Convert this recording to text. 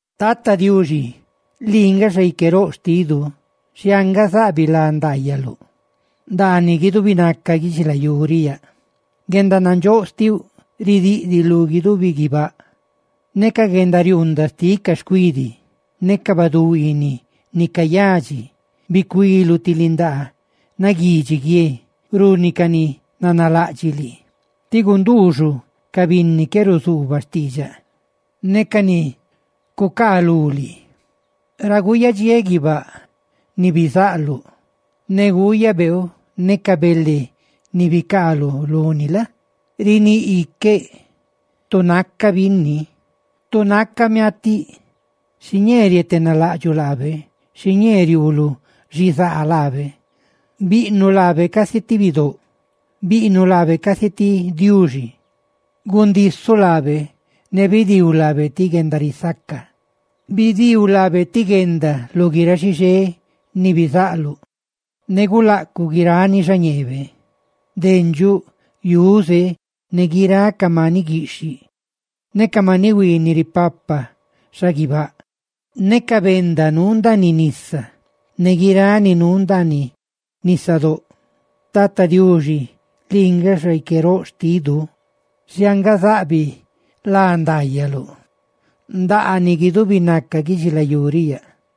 Tata Diuxi lii nga Xaique roꞌ xtidu, ¡xhianga zaꞌbiꞌ lá ndaayaluꞌ ndaaniꞌ guidubi naca guidxilayú riꞌ yaꞌ!, ¡guendanandxóꞌ xtiuꞌ ridiꞌdiꞌ lu guidubi guibáꞌ! Ne ca guendariuundaꞌ xtiꞌ ca xcuidi ne ca baduhuiiniꞌ ni cayadxi, bicuiluꞌ ti lindaa naguidxi guie runi ca ni nanalaꞌdxiꞌ lii, tí gunduuxuꞌ ca binni qué ruzuubaꞌ diidxaꞌ ne ca ni cucaalú lii. Ra guyadxiéꞌ guibáꞌ ni bizaꞌluꞌ, ne guuyaꞌ beeu ne ca bele ni bicaaluꞌ luni la? riníꞌ iqueꞌ: «Tu naca binni, tu naca miatiꞌ xiñee rietenalaꞌdxuꞌ laabe, xiñee riuuluꞌ xizaa xtibe.» Bizaꞌluꞌ laabe casi ñácabe ti ángel, biꞌnuꞌ laabe casi ti bidóꞌ, gundisuꞌ laabe ne bidiiluꞌ laabe ti guendarisaca. Bidiiu laabe ti guenda lu guiráꞌ xixé ni bizaꞌluꞌ, ne gulaꞌcuꞌ guirani xañeebe: dendxuꞌ, yuze, ne guiráꞌ ca maniꞌ guiꞌxhiꞌ, ne ca maniꞌ huiiniꞌ ripapa xaguibáꞌ, ne ca benda nuu ndaaniꞌ nisa, ¡ne guiráꞌ ni nuu ndaaniꞌ nisadóꞌ! Tata Diuxi lii nga Xaique roꞌ xtidu, ¡xhianga zaꞌbiꞌ lá ndaayaluꞌ ndaaniꞌ guidubi naca guidxilayú riꞌ yaꞌ!